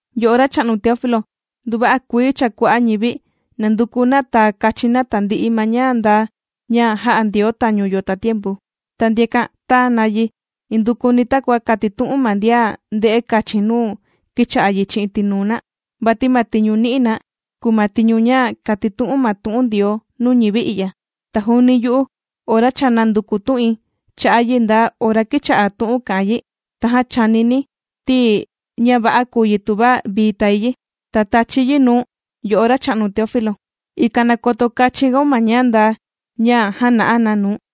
Yo'o racha'nu Teófilo, nduva'a kuii cha kua'a' ñivi nànduku na tàa kachin na tandi'i ma ña ndaa ña jā'a Ndioo tañu yo tatiempu. Ta ndiakan tāa na yi indukuni takua kātitu'un ma ndian ndē'e kachin nuu kīcha'a yi chi'in tinuu na, vati ma tiñu nī'i na kùu ma tiñu ña kàtitu'un na tu'un Ndioo nuu ñivi i'ya. Ta juuni yu'u ora cha nānduku tu'in cha'a' yi nda ora kīcha'a tu'un kà'an yi, tajan chànini̱ ti, ña va'a kùu yi tuva vii tài yi, ta tàchi̱ yi nuu̱n, yo'o racha'nu Teófilo, ikan na koto kachin gaun ma ña ndaa ña jāna'a na nuu̱n.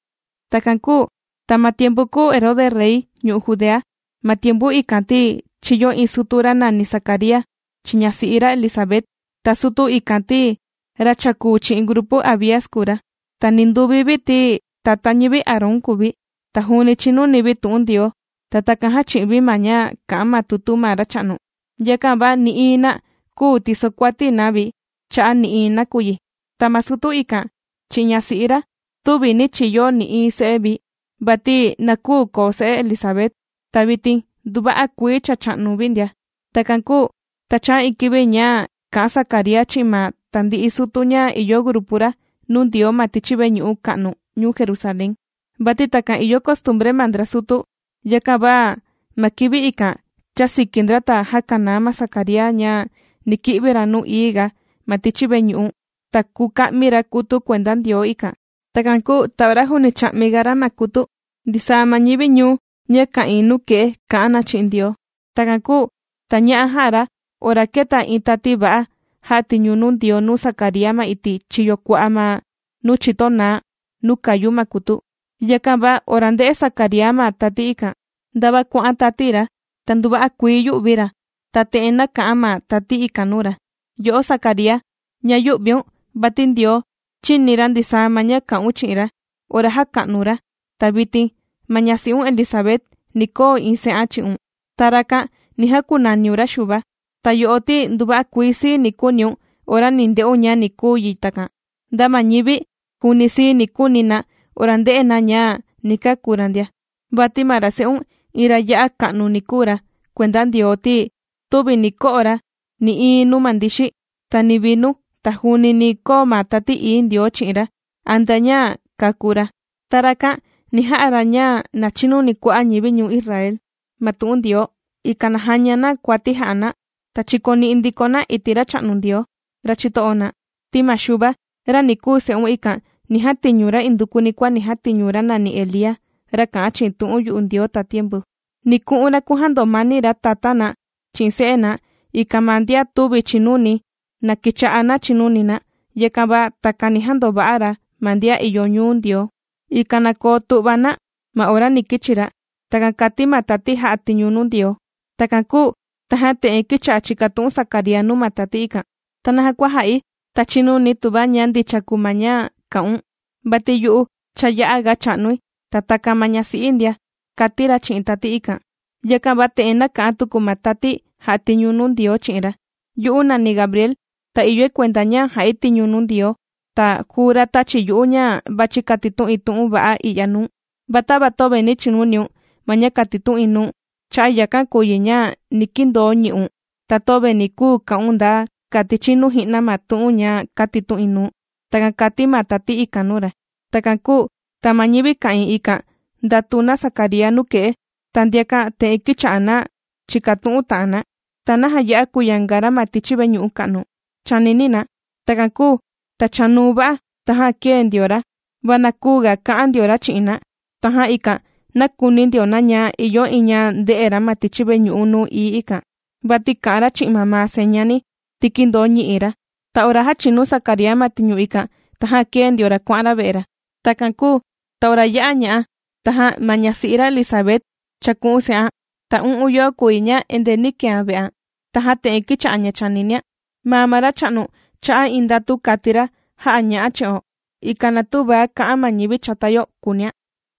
Takan kūu ta ma tiempu kūu Herode rey ñu'u' Judea, ma tiempu ikan ti, chīyo iin sutu ra nàni Zacaría chi'in ñasi'i ra Elisabet. Ta sutu ikan ti, ra chàkuu chi'in grupu Abías kùu ra. Ta ninduvi vi ti, tata ñivi Aarón kùu vi. Ta juuni chìnuni vi tu'un Ndioo, ta takan jàchi'in vi ma ña kà'an ma tutu ma Racha'nu. Yakan va nï'iin na küu tisokuati na vi cha'a' nï'iin nakuyi. Ta ma sutu ikan chi'in ñasi'i ra tüvi nī chiyo nï'iin se'e vi, vati na küu koo se'e Elisabet. Ta vitin nduva'a kuii cha chà'nu vi ndia. Takan kūu ta chāa iin kivi ña kà'an Zacaría chi'in ma tandi'i sutu ña ìyo grupu ra nuu Ndioo ma tichi veñu'u ka'nu ñuu Jerusalén. Vati takan ìyo costumbre ma ndra sutu, yakan va ma kivi ikan chāsiki ndra ta jākanaa ma Zacaría ña ni ki'vi ra nuu ií ga ma tichi veñu'u ta kuka'mi ra kutu kuenda Ndioo ikan. Takan kūu ta ora juuni chà'miga ra ma kutu, ndisaa ma ñivi ñuu ña ka'ìin nuke'e kà'an na chi'in Ndioo. Takan kūu ta ña'a jà'a ra ora kēta iin tati va'a jà'a tiñu nuu Ndioo nuu Zacaría ma iti' chiyo kua'a' ma nuu chito naá nuu kàyu ma kutu. Yakan va ora ndē'e Zacaría ma tati ikan, ndava kuà'an tati ra, ta nduva'a kuii yū'vi ra. Ta te'en nāka'an ma tati ikan nuu ra: ―Yo'o Zacaría, na yü'viun, vati Ndioo chīni ra ndisaa ma ña kà'un chi'in ra ora jàka'nu̱n ra, ta vitin ma ñasi'un Elisabet ni koo iin se'an chi'un. Ta rakan ni jakunaniun ra Xuva. Ta yo'o ti nduva'a kuii sii ni kuuniun ora ni nde'un ña ni kuu yi takan, nda ma ñivi, juuni sii ni kuuni na ora nde'e na ña ni kàku ra ndia. Vati ma ra se'un iin ra ya'a ka'nu ni kuu ra kuenda Ndioo, ti tüvi ni ko'o ra nï'iin nuu ma ndixi, ta ni vinu, ta juuni ni koo ma Tati Ií Ndioo chi'in ra antea ña kàku ra. Ta rakan ni ja'a ra ña na chinuni kua'a' ñivi ñuu Israel ma tu'un Ndioo, ikan na jaña na kuati jà'a na ta chikoni'i ndiko na iti' Racha'nu Ndioo, ra chito'o na. Ti ma Xuva ra ni kuu se'un ikan, ni jatiñu ra indukuni kua jātiñu ra nàni Elía, ra kà'an chi'in tu'un yu'u Ndioo tatiempu. Ni ku'un ra kujandomani ra tatá na chi'in se'e na, ikan ma ndian tüvi chìnuni, na kicha'a na chinuni na. Yakan va takan ni jandova'a ra ma ndian ìyo ñuu Ndioo, ikan na koo tu'va na ma ora ni kichi ra. ―Takan kàti ma tati jà'a tiñu nuu Ndioo. Takan kūu tajan te'en kīcha'a chìkatu'un Zacaría nuu ma tati ikan: ―¿Ta naja kua jà'i ta chinuni̱ tuva ña ndicha kùu ma ña kà'un, vati yu'u cha ya'aga cha'nui, ta takan ma ñasi'i̱ ndia? ―kàti ra chi'in tati ikan. Yakan va te'en nāka'an tuku ma tati jà'a tiñu nuu Ndioo chi'in ra: ―Yu'u nàni Gabriel, ta ìyoi kuenda ña ja'i tiñu nuu Ndioo. Ta juu ra tāchi yu'u ña vàchi katitu'in tu'un va'a i'ya nuu̱n. Va tava töve nī chinuniun ma ña kātitu'in nuu̱n, cha'a' yakan kùu yi ña ni kindoo ñi'un. Ta töve ni kuu ka'un nda kati chinu ji'na ma tu'un ña kàtitu'in nuu̱n. ―Takan kàti ma tati ikan nuu ra. Takan kūu ta ma ñivi ka'ìin ikan ndàtu na Zacaría nuke'e, ta ndiakan te'en kīcha'a na chìkatu'un ta'an na: ―¿Ta naja ya'a kùyanga ra ma tichi veñu'u ka'nu? ―chànini na. Takan kūu ta chanuu va'a tajan kēe ndio ra, va na küuga ka'an ndio ra chi'in na. Tajan ikan nākuni ndio na ña ìyo iin ña ndē'e ra ma tichi veñu'u nuu ií ikan, vati kà'an ra chi'in mamaa señani, ti kīndoo ñi'i ra. Ta ora jāchinu Zacaría ma tiñu ikan, tajan kēe ndio ra kuà'an ra ve'e ra. Takan kūu ta ora yā'a ña'a, tajan ma ñasi'i ra Elisabet, chāku'un se'an. Ta u'un yoo kùu yi ña endee nī kean ve'an. Tajan te'en kīcha'a ña chàninian: “Maa ma Racha'nu cha'a' iin ndatu, jā'a ña'a' chi'o, ikan na tüva ka'an ma ñivi chata yo”, kūunian.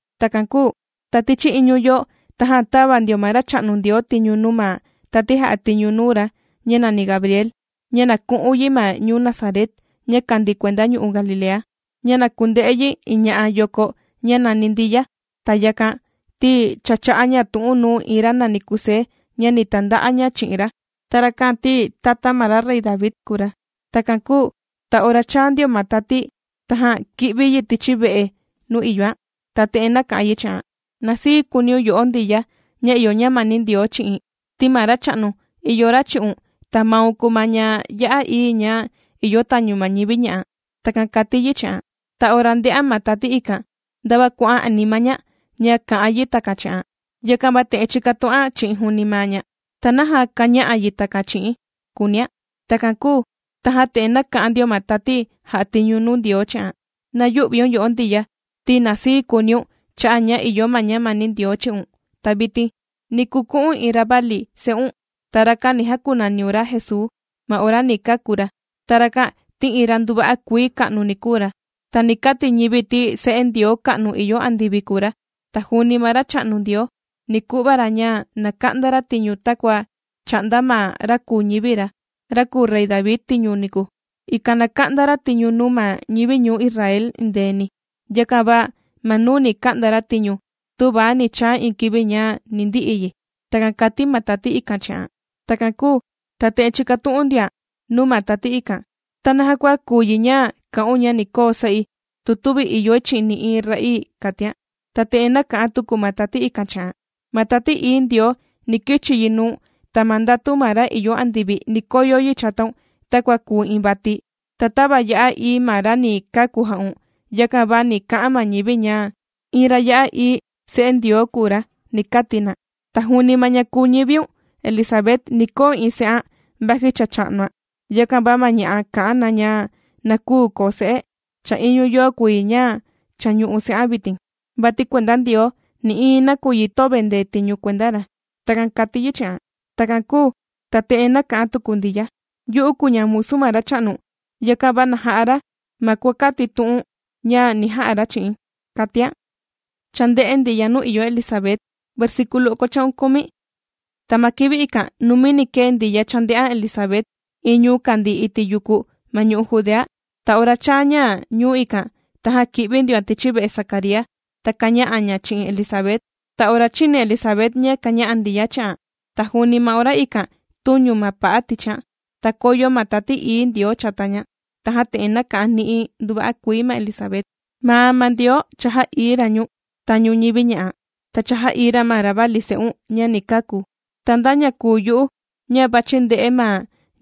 Takan kūu ta tichi iñu yoo, tajan tāva ndio ma Racha'nu Ndioo tiñu nuu ma tati jà'a tiñu nuu ra ña nàni Gabriel, ña na ku'un yi ma ñuu Nazaret, ña kàndii kuenda ñu'u' Galilea, ña na kunde'e yi iin ña'a yoko ña nàni Ndiya. Ta yakan ti, cha chā'a ña tu'un nuu iin ra nàni Kusé ña ni tanda'a ña chi'in ra. Ta rakan ti, tata ma ra rey David kùu ra. Takan kūu ta ora chāa ndio ma tati, tajan kī'vi yi tichi ve'e nuu ìyoan. Ta te'en nāka'an yi chi'an: ―¡Na sii kuuniun, yo'o Ndiya ña ìyo ñamani Ndioo chi'in, ti ma Racha'nu ìyo ra chi'un, ta maun kùu ma ña ya'a ií ña ìyo tañu ma ñivi ña'a! ―Takan kàti yi chi'an. Ta ora ndē'an ma tati ikan, ndava kuà'an anima ña, ña kà'an yi takan chi'an. Yakan va te'en chīkatu'an chi'in juuni maa ña: “¿Ta naja kàña'a yi takan chi'i̱n?”, kùunian. Takan kūu tajan te'en nāka'an ndio ma tati jà'a tiñu nuu Ndioo chi'an: ―¡Na yü'viun yo'o Ndiya, ti na sii kuuniun cha'a' ña ìyo ma ñamani Ndioo chi'un! Ta vitin, ni kuku'u̱n iin ravali se'un, ta rakan ni jakunaniun ra Jesuu ma ora ni kàku ra. Ta rakan, ti iin ra nduva'a kuii ka'nu ni kuu ra, ta ni kati ñivi ti Se'e Ndioo ka'nu ìyo andivi kùu ra. Ta juuni ma Racha'nu Ndioo ni ku'va ra ña na ka'nda ra tiñu takua chā'nda ma ra kūu ñivi ra, ra kùu rey David tiñu niku, ikan na ka'nda ra tiñu nuu ma ñivi ñuu Israel endeeni. Yakan va ma nuu ni ka'nda ra tiñu tüva ni chaa iin kivi ña ni ndi'i yi. ―Takan kāti ma tati ikan chi'an. Takan kūu ta te'en chīkatu'un ndioan nuu ma tati ikan: ―¿Ta naja kua kùu yi ña kà'un ña ni koo se'i, tu tüvi ìyoi chi'in nï'iin ra'ii? ―kàtian. Ta te'en nāka'an tuku ma tati ikan chi'an: ―Ma Tati Ií Ndioo, ni kichi yi nuu̱n, ta ma ndatu ma ra ìyo andivi ni koyo yi chataun takua kùu iin vati. Ta tava ya'a ií ma ra ni kàku ja'un, yakan va ni ka'an ma ñivi ña iin ra ya'a ií Se'e Ndioo kùu ra, ni kati na. Ta juuni ma ña kùu ñiviun Elisabet, ni koo iin se'an vaji cha cha'nuan. Yakan va ma ña'a kà'an na ña na küu koo se'e, cha iñu yoo kùu yi ña cha ñù'u se'an vitin. Vati kuenda Ndioo nï'iin nakuyi tüvi ndetiñu kuenda ra. ―Takan kàti yi chi'an. Takan kūu, ta te'en nāka'an tuku Ndiya: ―Yu'u kùu ña musu ma Racha'nu. Yakan va na ja'a ra ma kua kàtitu'u̱n ña ni ja'a ra chi'i̱n ―kàtian. Tajan ma tati, kēe yi ta kuà'an yi. Ta ma kivi ikan numini kēe Ndiya chānde'an Elisabet iin ñuu kàndii iti' yuku ma ñu'u' Judea. Ta ora chāa ña ñuu ikan, tajan kī'vi ndioan tichi ve'e Zacaría, ta kāña'a ña chi'in Elisabet. Ta ora chīni Elisabet ña kāña'a Ndiya chi'an, ta juuni ma ora ikan tūñu ma pa'a tichian, ta kōyo ma Tati Ií Ndioo chata ña. Tajan te'en nāka'an ni'i nduva'a kuii ma Elisabet: ―Ma maa Ndioo cha jà'ií ra ñu̱n tañu ñivi ña'a, ta cha jà'ií ra ma ravali se'un ña ni kaku. ¿Ta nda ña kùu yu'u ña vàchi nde'e ma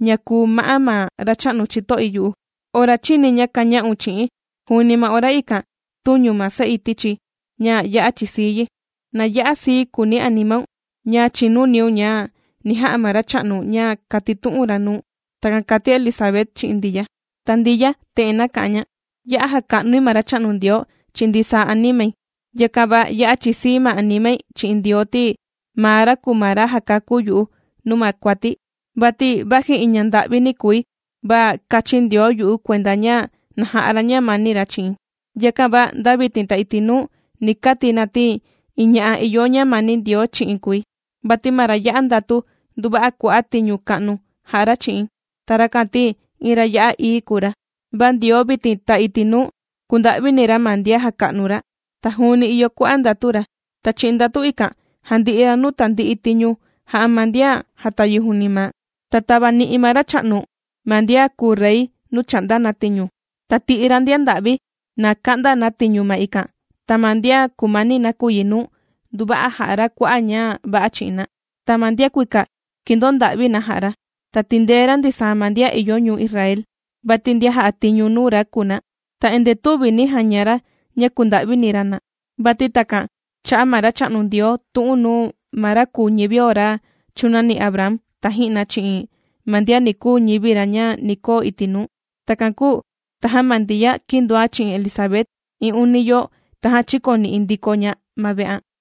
ña kùu ma'á ma Racha'nu chito'i yu'u? Ora chīni̱ ña kāña'un chi'i̱n, juuni ma ora ikan, tūñu ma se'i tichi̱ ña ya'a chìsii yi. ¡Na ya'a sii kuuni animaun ña chīnuniun ña ni ja'a ma Racha'nu ña kātitu'un ra nuu̱n! ―Takan kàti Elisabet chi'in Ndiya. Ta Ndiya te'en nāka'an ña: Ya'a jàka'nui ma Racha'nu Ndioo chi'in ndisaa animai. Yakan va ya'a chìsii ma animai chi'in Ndioo, ti maa ra kùu ma ra jàkakú yu'u nuu ma kuati̱. Vati vaji iin ñanda'vini kùi, va kāchin Ndioo yu'u kuenda ña na ja'a ra ma ñamani ra chi'i̱n. Yakan va nda vitin ta iti' nuu, ni kati na ti iin ña'a ìyo ñamani Ndioo chi'in kùi. Vati ma ra ya'a ndatu, nduva'a kua'a' tiñu ka'nu jà'a ra chi'i̱n. Ta rakan ti iin ra ya'a ií kùu ra. Va Ndioo vitin ta iti' nuu kùnda'vini ra ma ndian jàka'nu ra. Ta juuni ìyo kua'a' ndatu ra. Ta chi'in ndatu ikan jàndi'i ra nuu tandi'i tiñu jà'a ma ndian jàtayi juuni maa. Ta tāvani'i ma Racha'nu ma ndian kùu rey nuu chà'nda na tiñu, ta tī'i ra ndian nda'vi na ka'nda na tiñu ma ikan. Ta ma ndian kùmani nakuyi nuu, nduva'a jà'a ra kua'a' ña va'a chi'in na, ta ma ndian kuika, kìndonda'vi na jā'a ra. Ta tìndee ra ndisaa ma ndian ìyo ñuu Israel, vati ndian jà'a tiñu nuu ra kùu na, ta endee tüvi nī jaña ra ña kùnda'vini ra na. Vati takan chā'a ma Racha'nu Ndioo tu'un nuu ma ra kūu ñivio ra chūnani Abraham taji'na, chi'in ma ndian ni kuu ñivi ra ña ni koo iti' nuu. Takan kūu tajan ma Ndiya kīndoan chi'in Elisabet iin uni yoo, tajan chīkoni'i ndiko ña ma ve'an.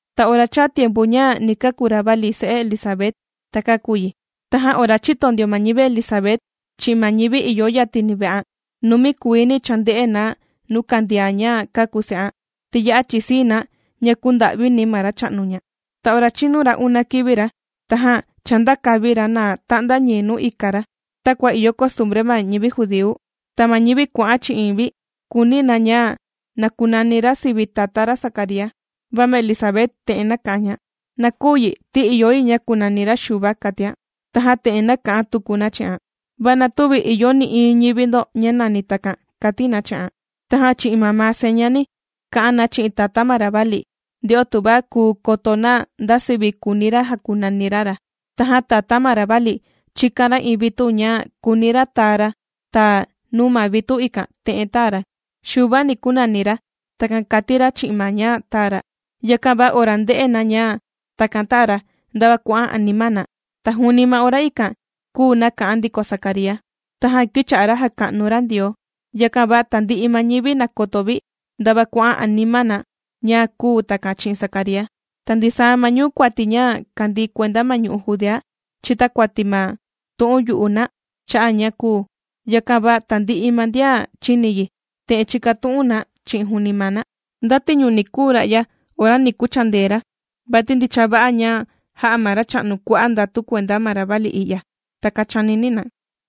Ta ora chāa tiempu ña ni kàku ravali se'e Elisabet, ta kāku yi. Tajan ora chīto ndio ma ñivi Elisabet, chi'in ma ñivi ìyo yatini ve'an, numi kuiini chānde'e na nuu kàndian ña kāku se'an, ti ya'a chìsii na ña kūnda'vini ma Racha'nu ña. Ta ora chīnu ra una kivi ra, tajan chāndaka vi ra na ta'nda ñii nuu ika ra takua ìyo costumbre ma ñivi judíu. Ta ma ñivi kuà'an chi'in vi kùuni na ña na kunani ra sivi tatá ra Zacaría. Va ma Elisabet te'en nāka'an ña: ―¡Na küu yi! Ti ìyo yi ña kunani ra Xuva ―kàtian. Tajan te'en nāka'an tuku na chi'an: ―Va na tüvi ìyo nï'iin ñivi ndo ña nàni takan ―kàti na chi'an. Tajan chi'in mamaa señani kà'an na chi'in tatá ma ravali, nde'o tuva kùu koto na nda sivi kùuni ra jakunani ra ra. Tajan tatá ma ravali chīkan ra iin vitu ña kùuni ra taa ra. Ta nuu ma vitu ikan te'en tāa ra: “Xuva, ni kunani ra.” Takan kāti ra chi'in ma ña tāa ra. Yakan va ora ndē'e na ña takan tāa ra, ndava kuà'an anima na. Ta juuni ma ora ikan kūu naka'an ndiko Zacaría. Tajan kīcha'a ra jàka'nu ra Ndioo. Yakan va tandi'i ma ñivi nàkoto vi, ndava kuà'an anima na ña kūu takan chi'in Zacaría. Ta ndisaa ma ñuu kuati ña kàndii kuenda ma ñu'u' Judea, chìtakuati ma tu'un yu'u na cha'a' ña kūu. Yakan va tandi'i ma ndian chīni yi, te'en chīkatu'un na chi'in juuni maa na: ―¿Nda tiñu ni kuu ra'ya ora ni kuchandee ra? Vati ndicha va'a ña jā'a ma Racha'nu kua'a' ndatu kuenda ma ravali i'ya. ―Takan chànini na.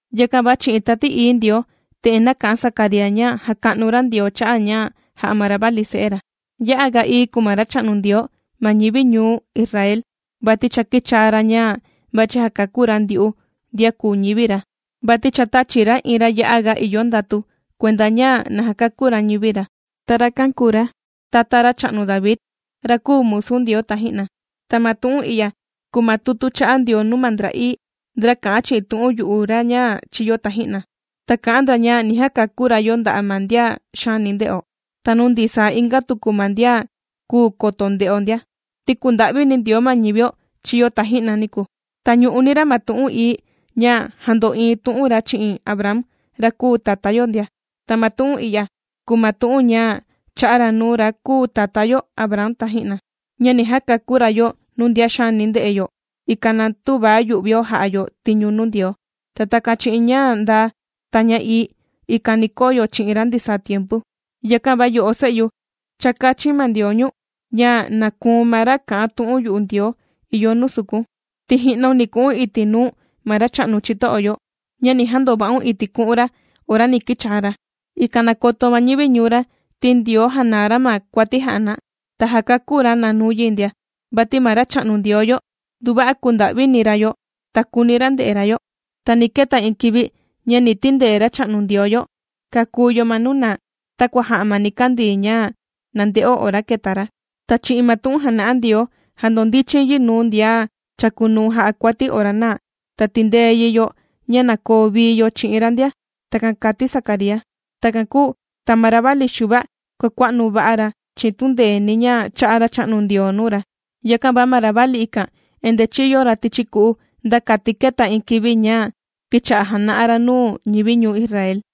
Yakan va chi'in Tati Ií Ndioo, te'en nāka'an Zacaría ña jàka'nu ra Ndioo cha'a' ña ja'a ma ravali se'e ra: ¡Ya'a ga ií kùu ma Racha'nu Ndioo ma ñivi ñuu Israel, vati cha kīchaa ra ña vàchi jakakú ra ndyu'u ndian kùu ñivi ra! Vati cha tāchi ra iin ra ya'aga ìyo ndatu, kuenda ña na jakakú ra ñivi ra. Ta rakan kùu ra tata racha'nu David, ra kūu musu Ndioo taji'na. Ta ma tu'un i'ya kùu ma tutu chā'a Ndioo nuu ma ndra ií, ndra kā'an chi'in tu'un yu'u ra ña chīyo taji'na, ta kā'an ndra ña ni jakakú ra yo nda'a' ma ndian xaani nde'o, ta nuu ndisaa inga tuku ma ndian küu koto nde'o ndia. Ti kùnda'vini Ndioo ma ñivio chīyo taji'na niku, ta ñù'uni ra ma tu'un ií ña jāndo'iin tu'un ra chi'in Abraham, ra kūu tatá yo ndia. Ta ma tu'un i'ya kùu ma tu'un ña chā'a ra nuu ra kūu tatá yo Abraham taji'na, ña ni jakakú ra yo nuu ndian xaani nde'e yo, ikan na tüva yu'vio ja'a yo tiñu nuu Ndioo. Ta takan chi'in ña ndaa, ta ña ií, ikan ni koo yo chi'in ra ndisaa tiempu. Yakan va yo'o se'yu, cha kāchin ma Ndioo ñu̱n, ña na kùu̱n ma ra kà'an tu'un yu'u Ndioo ìyo nuu sukun, ti ji'naun ni ku'un iti' nuu ma Racha'nu chito'o yo, ña ni jandova'un iti' ku'un ra ora ni kichaa ra, ikan na koto ma ñivi ñuu ra, ti Ndioo jànaa ra ma kuati jà'a na, ta jàkakú ra na nuu yi ndia. Vati ma Racha'nu Ndioo yo, nduva'a kùnda'vini ra yo, ta kùuni ra nde'e ra yo, ta ni keta iin kivi, ña ni tindee Racha'nu Ndioo yo kakú yo ma nuu naa, takua jà'a ma nikandii ña na nde'o ora kèta ra. Ta chi'in ma tu'un jàna'a Ndioo, jàndondichin yi nuu ndian chàkunuu jà'a kuati ora naa, ta tìndee yi yo ña na koo vii yo chi'in ra ndia. Takan kāti Zacaría. Takan kūu ta ma ravali Xuva kuàkua'nu va'a ra chi'in tundeeni ña chà'a Racha'nu Ndioo nuu ra. Yakan va ma ravali ikan endee chīyo ra tichi ku'u, nda kati kēta iin kivi ña kīcha'a jàna'a ra nuu ñivi ñuu Israel.